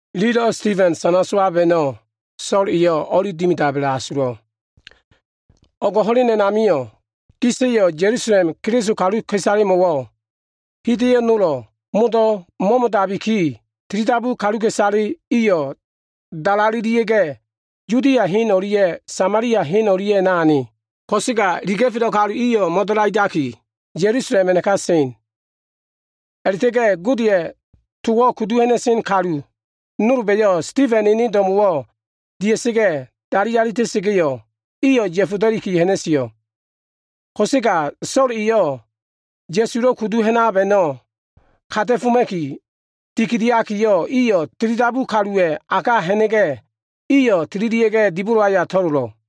Ililo꞉ Sitifen sana sowab a꞉no꞉, So꞉l eyo꞉ o꞉li dimidab a꞉la꞉asulo꞉. O꞉g ho꞉len a꞉namio꞉ gis kaluwa꞉yo꞉ Ya꞉lusalem Keliso kaluka꞉isalemo꞉wo꞉ hida꞉yo꞉ modo꞉ nolo꞉ mo꞉mo꞉dabiki, tilidabu kaluka꞉isale iyo꞉ dalalelia꞉ga꞉, Yudia hen o꞉lia꞉ Samalia hen o꞉lia꞉ a꞉na ane. Ko꞉sega iliga꞉felo꞉ kalu iyo꞉ mo꞉dalaidaki, Ya꞉lusalem a꞉naka sen. A꞉la꞉ta꞉ga꞉ Godeya꞉ tolo꞉ kudu ha꞉na꞉sen kalu nolba꞉yo꞉ Sitifena꞉ ene do꞉mo꞉wo꞉ dia꞉sa꞉ga꞉, dali alita꞉sa꞉ga꞉yo꞉, iyo꞉ ya꞉foda꞉li ha꞉na꞉sio꞉. Ko꞉sega So꞉l eyo꞉ Ya꞉sulo꞉ kudu ha꞉nab a꞉no꞉ kata꞉foma꞉ki dikidiakiyo꞉, eyo꞉ tilidabu kaluwa꞉ a ka ha꞉na꞉ga꞉, iyo꞉ tililia꞉ga꞉ dibolo aya to꞉lolo꞉.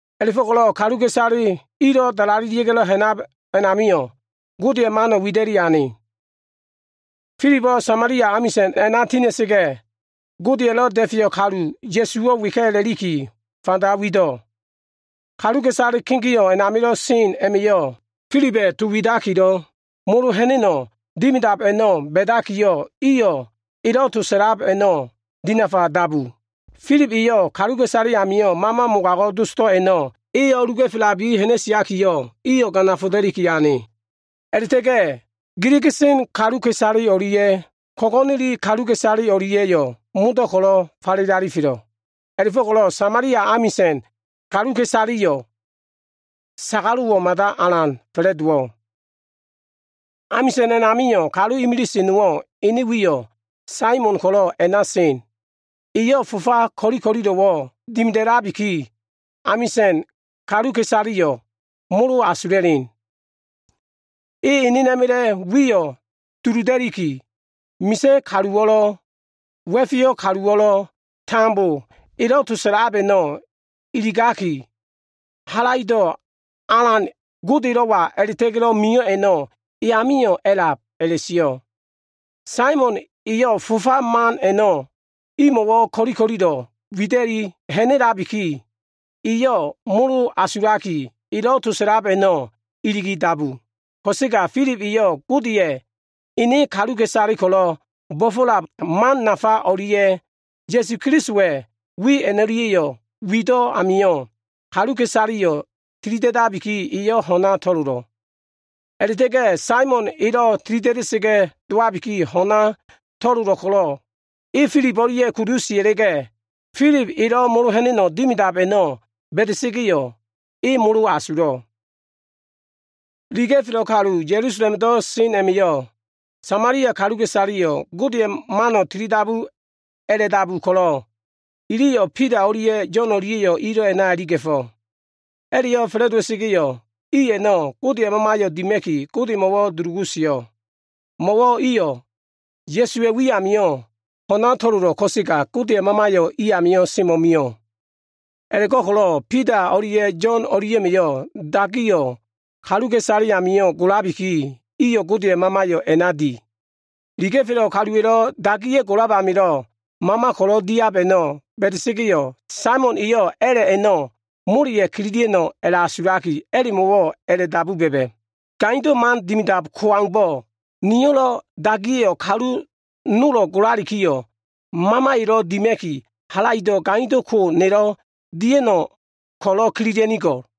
A꞉la꞉fo꞉ko꞉lo꞉ kaluka꞉isale ilo꞉ dalalelia꞉ga꞉lo꞉ ha꞉nab a꞉namio꞉, Godeya꞉ to nafayo꞉ wida꞉li ane. Filibo꞉ Samalia amisa꞉n a꞉na tina꞉sa꞉ga꞉, Godeya꞉lo꞉ Da꞉feyo꞉ Kalu Ya꞉suwo꞉ weka꞉ a꞉la꞉liki fanda wido꞉. Kaluka꞉isale kegeo꞉ a꞉namilo꞉ sen a꞉ma꞉yo꞉ Filiba꞉ to widakilo꞉ molo ha꞉na꞉no꞉ dimidab a꞉no꞉ ba꞉dakiyo꞉, iliyo꞉ elo꞉ to sa꞉lab a꞉no꞉ dinafa dabu. Filib eyo꞉ kaluka꞉isale amilo꞉ mama mogago꞉ dosdo꞉ a꞉no꞉ e o꞉luga꞉felabiki ha꞉na꞉siakiyo꞉, iyo꞉ ganafoda꞉liki ane. A꞉la꞉ta꞉ga꞉ ko꞉go꞉neli kaluka꞉isale o꞉lia꞉ giliga꞉sen kaluka꞉isale o꞉lia꞉yo꞉ modo꞉ ko꞉lo꞉ falele alifelo꞉. A꞉la꞉fo꞉ko꞉lo꞉ Samalia amisa꞉n kaluka꞉isaleyo꞉ sagalo꞉wo꞉ mada alan fa꞉la꞉dowo꞉. Amisa꞉n a꞉namio꞉ kalu imilise nowo꞉ ene wiyo꞉ Saimon ko꞉lo꞉ a꞉na sen. Eyo꞉ fofa ko꞉li ko꞉lilo꞉ dimida꞉labiki, Samalia amisa꞉n kaluka꞉isaleyo꞉ molo asula꞉len. E enena꞉ma꞉la꞉ wiyo꞉ duluda꞉liki, misa꞉ kaluwo꞉lo꞉, wa꞉feyo꞉ kaluwo꞉lo꞉ tambo elo꞉ to sa꞉lab a꞉no꞉ iligakiyo꞉, “Halaido꞉ Alan, Godelo꞉wa a꞉la꞉ta꞉ga꞉lo꞉ mio꞉ a꞉no꞉ e amio꞉ a꞉lab” a꞉la꞉sio꞉. Saimon eyo꞉ fofa man a꞉no꞉ imo꞉wo꞉ ko꞉li ko꞉lilo꞉ wida꞉li ha꞉na꞉labiki, iyo꞉ molo asulaki elo꞉ to sa꞉lab a꞉no꞉ iligi dabu. Ko꞉sega Filib eyo꞉ Godeya꞉ ene kaluka꞉isale ko꞉lo꞉ bo꞉fo꞉lab man nafa o꞉lia꞉, Ya꞉su Kelisowa꞉ wi a꞉no꞉lia꞉yo꞉ wido꞉ amio꞉, kaluka꞉isaleyo꞉ tilida꞉dabiki, iyo꞉ ho꞉na to꞉lolo꞉. A꞉la꞉ta꞉ga꞉ Saimon elo꞉ tilida꞉da꞉sa꞉ga꞉ dowabiki ho꞉na to꞉lolo꞉ ko꞉lo꞉, e Filib o꞉lia꞉ kudu sia꞉la꞉ga꞉, Filib elo꞉ molo ha꞉na꞉no꞉ dimidab a꞉no꞉ ba꞉da꞉ga꞉yo꞉, e molo asulo꞉. Iliga꞉felo꞉ kalu Ya꞉lusalemdo꞉ sen a꞉ma꞉yo꞉, Samalia kaluka꞉isaleyo꞉ Godeya꞉ mano꞉ tilidabuka꞉ a꞉la꞉dabu ko꞉lo꞉, iliyo꞉ Bida o꞉lia꞉ Yo꞉n dia꞉yo꞉ ilo꞉ a꞉na iliga꞉fo꞉. A꞉la꞉yo꞉ fa꞉la꞉dowa꞉sa꞉ga꞉yo꞉, i a꞉no꞉ Godeya꞉ Mamayo꞉ dima꞉ki, Godemo꞉wo꞉ dulugu sio꞉. Mo꞉wo꞉ iyo꞉ Ya꞉suwa꞉ wi amio꞉ ho꞉na to꞉lolo꞉ ko꞉sega, Godeya꞉ Mamayo꞉ i amio꞉ semo꞉mio꞉. A꞉la꞉go꞉ko꞉lo꞉ Bida o꞉lia꞉ Yo꞉n dia꞉ma꞉yo꞉ dagiyo꞉ kaluka꞉isale amio꞉ golabiki, iyo꞉ Godeya꞉ Mamayo꞉ a꞉na di. Iliga꞉felo꞉ kaluwa꞉lo꞉ dagiya꞉ golab amilo꞉ Mama ko꞉lo꞉ diab a꞉no꞉ ba꞉da꞉ga꞉yo꞉, Saimon eyo꞉ a꞉la꞉ a꞉no꞉ moleya꞉ kililia꞉no꞉ asulaki, a꞉la꞉mo꞉wo꞉ dabu ba꞉ba꞉, “Gaindo꞉ man dimidab ko aumbo꞉, niyo꞉lo꞉ dagiya꞉yo꞉ kalu nolo꞉ golalikiyo꞉ Mamayo꞉lo꞉ dima꞉ki, halaido꞉ gaindo꞉ ko nelo꞉ dia꞉no꞉ ko꞉lo꞉ kililia꞉nigo꞉l.”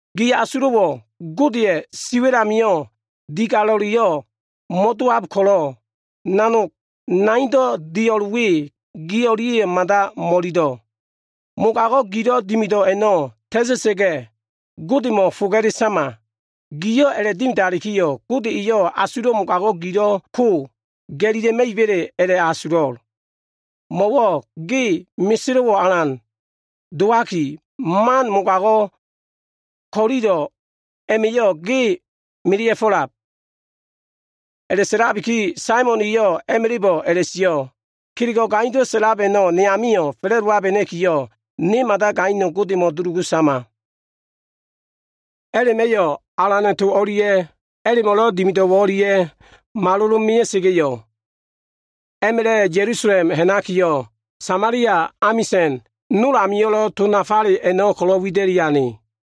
Gi asulo꞉wo꞉ Godeya꞉ siwa꞉l amio꞉ digalo꞉leyo꞉ mo꞉a꞉lab ko꞉lo꞉, nanog naindo꞉ dio꞉l we, ge o꞉lia꞉yo꞉ mada mo꞉ililo꞉. Mogago꞉ gilo꞉ dimido꞉ a꞉no꞉ ta꞉ta꞉sa꞉ga꞉, Godemo꞉ foga꞉le sama. Giyo꞉ a꞉la꞉dimidalikiyo꞉, Gode eyo꞉ asulo꞉ mogago꞉ gilo꞉ ko ga꞉lila꞉ma꞉iba꞉le a꞉la꞉asulo꞉l. Mo꞉wo꞉ ge meselo꞉wo꞉ alan dowaki, man mogago꞉ ko꞉lilo꞉ a꞉ma꞉yo꞉ ge melea꞉fo꞉lab.” A꞉la꞉sa꞉labiki, Saimon eyo꞉ a꞉ma꞉la꞉bo꞉ a꞉la꞉sio꞉, “Kelego꞉ gaindo꞉ sa꞉lab a꞉no꞉ ne amio꞉ fa꞉la꞉dowabena꞉kiyo꞉, ne mada gaino꞉ Godemo꞉ dulugu sama.” A꞉la꞉ma꞉yo꞉ Alana꞉ to o꞉lia꞉ a꞉la꞉mo꞉lo꞉ dimido꞉ o꞉lia꞉yo꞉ malolo꞉ mea꞉sa꞉ga꞉yo꞉, a꞉ma꞉la꞉ Ya꞉lusalem ha꞉nakiyo꞉, Samalia amisa꞉n nol amio꞉lo꞉ to nafale a꞉no꞉ ko꞉lo꞉ wida꞉li ane.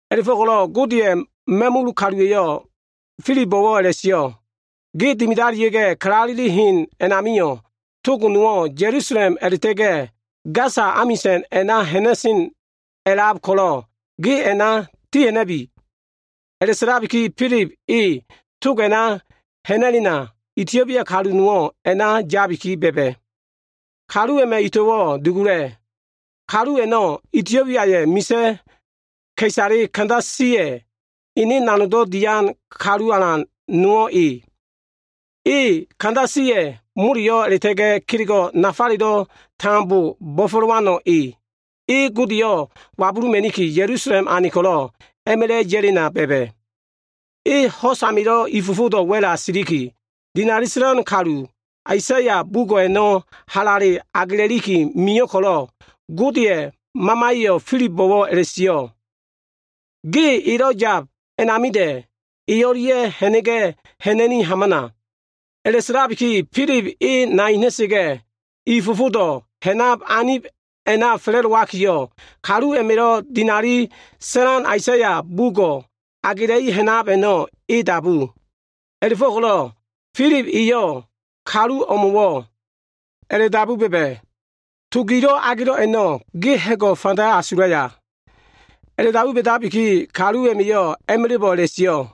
A꞉la꞉fo꞉ko꞉lo꞉ Godeya꞉ ma꞉mul kaluwa꞉yo꞉ Filibo꞉wo꞉ a꞉la꞉sio꞉, “Ge dimidalia꞉ga꞉, kalaleli hen a꞉namio꞉ tog nowo꞉ Ya꞉lusalem a꞉la꞉ta꞉ga꞉ Gasa amisa꞉n a꞉na ha꞉na꞉sen a꞉lab ko꞉lo꞉, ge a꞉na ti ha꞉na꞉bi.” A꞉la꞉sa꞉labiki, Filib e tog a꞉na ha꞉na꞉lena, Itiobia kalu nowo꞉ a꞉na yabiki ba꞉ba꞉. Kalu a꞉ma꞉ ito꞉wo꞉ dugula꞉. Kalu a꞉no꞉ Itiobiaya꞉ misa꞉ ka꞉isale, Kandasiya꞉ ene nanogdo꞉ dian kalu alan nowo꞉ e. E Kandasiya꞉ moleyo꞉ a꞉la꞉ta꞉ga꞉ kelego꞉ nafalelo꞉ tambo bo꞉fo꞉lowano꞉ e. E Godeyo꞉ wabuluma꞉niki, Ya꞉lusalem ane ko꞉lo꞉ a꞉ma꞉la꞉ ya꞉lena ba꞉ba꞉. E ho꞉s amilo꞉ i fofodo꞉ wa꞉la siliki, dinali sa꞉lan kalu, Aisaya bugo꞉ a꞉no꞉ halale agela꞉liki mio꞉ ko꞉lo꞉, Godeya꞉ Mamaya꞉yo꞉ Filibo꞉wo꞉ a꞉la꞉sio꞉, “Ge elo꞉ yab anidoba꞉da꞉, e o꞉lia꞉ ha꞉na꞉ga꞉ ha꞉na꞉ni hamana.” A꞉la꞉sa꞉labiki, Filib e nai ha꞉na꞉sa꞉ga꞉, i fofodo꞉ ha꞉nab anib a꞉na fa꞉la꞉dowakiyo꞉, kalu a꞉ma꞉lo꞉ dinali sa꞉lan Aisaya bugo꞉ agela꞉i ha꞉nab a꞉no꞉, e dabu. A꞉la꞉fo꞉ko꞉lo꞉ Filib eyo꞉ kalu o꞉mo꞉wo꞉ a꞉la꞉dabu ba꞉ba꞉, “To gilo꞉ agelo꞉ a꞉no꞉, ge ha꞉go꞉ fanda asulaya?” A꞉la꞉dabu ba꞉dabiki, kalu a꞉ma꞉yo꞉ a꞉ma꞉la꞉bo꞉ a꞉la꞉sio꞉,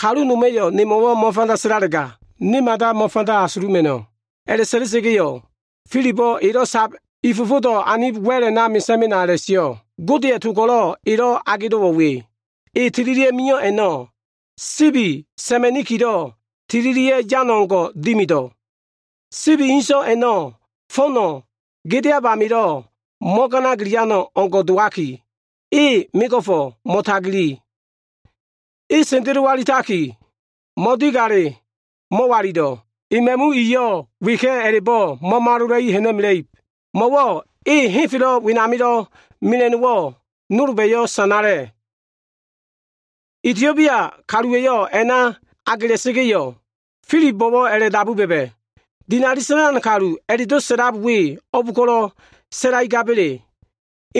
“Kalu noma꞉yo꞉ nemo꞉wo꞉ mo꞉fanda sa꞉lalega, ne mada mo꞉fanda asuluma꞉no꞉.” A꞉la꞉sa꞉la꞉sa꞉ga꞉yo꞉, Filibo꞉ elo꞉ sab i fofodo꞉ anib wa꞉l a꞉na “Mesa꞉ mena” a꞉la꞉sio꞉. Godeya꞉ to ko꞉lo꞉ elo꞉ agelo꞉wo꞉ we, “E tililia꞉ mio꞉ a꞉no꞉, sibi sa꞉ma꞉nikilo꞉ tililia꞉ yan o꞉ngo꞉ dimido꞉. Sibi inso꞉ a꞉no꞉ fo꞉no꞉ gedeab amilo꞉ mo꞉ganagiliano꞉ o꞉ngo꞉ dowaki, e mego꞉fo꞉ mo꞉tagali. E sendelowalitaki, mo꞉digale mo꞉walilo꞉. E ma꞉mu iyo꞉ weka꞉ a꞉la꞉bo꞉ mo꞉malola꞉i ha꞉na꞉mela꞉ib, Mo꞉wo꞉ e henfelo꞉ wenamilo꞉ mela꞉no꞉wo꞉ nolba꞉yo꞉ sanala꞉.” Itiobia kaluwa꞉yo꞉ to a꞉no꞉ agela꞉sa꞉ga꞉yo꞉, Filibo꞉wo꞉ a꞉la꞉dabu ba꞉ba꞉, “Dinali sa꞉lan kaluwa꞉lo꞉ a꞉la꞉do꞉ sio꞉ we, o꞉b ko꞉lo꞉ sa꞉laigaba꞉le?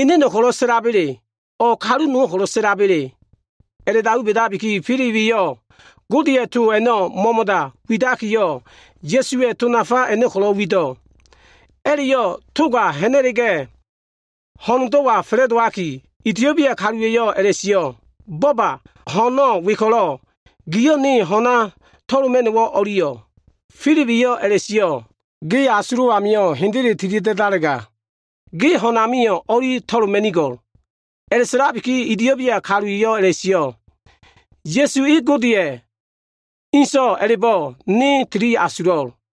Eneno꞉ ko꞉lo꞉ sa꞉laba꞉le? O꞉ kalu nowo꞉ ko꞉lo꞉ sa꞉laba꞉le?” A꞉la꞉dabu ba꞉dabiki, Filib eyo꞉ Godeya꞉ to a꞉no꞉ mo꞉mo꞉da widakiyo꞉, Ya꞉suwa꞉ to nafa a꞉no꞉ ko꞉lo꞉ wido꞉. A꞉la꞉yo꞉ toga ha꞉na꞉la꞉ga꞉, ho꞉ndo꞉wa fa꞉la꞉dowakiyo꞉ Itiobia kaluwa꞉yo꞉ a꞉la꞉sio꞉, “Bo꞉ba! Ho꞉no꞉ we ko꞉lo꞉, gio꞉ ne ho꞉na to꞉loma꞉no꞉wo꞉ o꞉liyo꞉?” Filib eyo꞉ a꞉la꞉sio꞉, “Ge asulo꞉ amio꞉ hendele tilida꞉dalega, ge ho꞉n amio꞉ o꞉li to꞉loma꞉nigo꞉l.” A꞉la꞉sa꞉labiki, Itiobia kalu eyo꞉ a꞉la꞉sio꞉, “Ya꞉su E Godeya꞉ ene So꞉wa a꞉la꞉bo꞉ ne tili asulo꞉l.”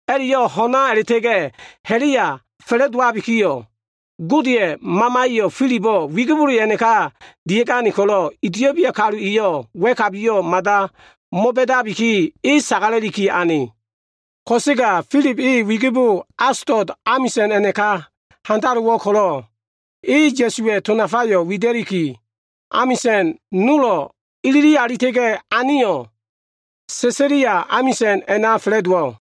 A꞉la꞉yo꞉ ho꞉na a꞉la꞉ta꞉ga꞉ ha꞉la꞉ya fa꞉la꞉dowabikiyo꞉, Godeya꞉ Mamaya꞉yo꞉ Filibo꞉ wigibole a꞉naka dia꞉gane ko꞉lo꞉, Itiobia kalu eyo꞉ wa꞉kabiyo꞉ mada mo꞉ba꞉dabiki, e sagala꞉liki ane. Ko꞉sega Filib e wigibo Asotus amisa꞉n a꞉naka handalowo꞉ ko꞉lo꞉, e Ya꞉suwa꞉ to nafayo꞉ wida꞉liki, amisa꞉n nolo꞉ ilili alita꞉ga꞉ aneyo꞉, Sesalia amisa꞉n a꞉na fa꞉la꞉dowo꞉.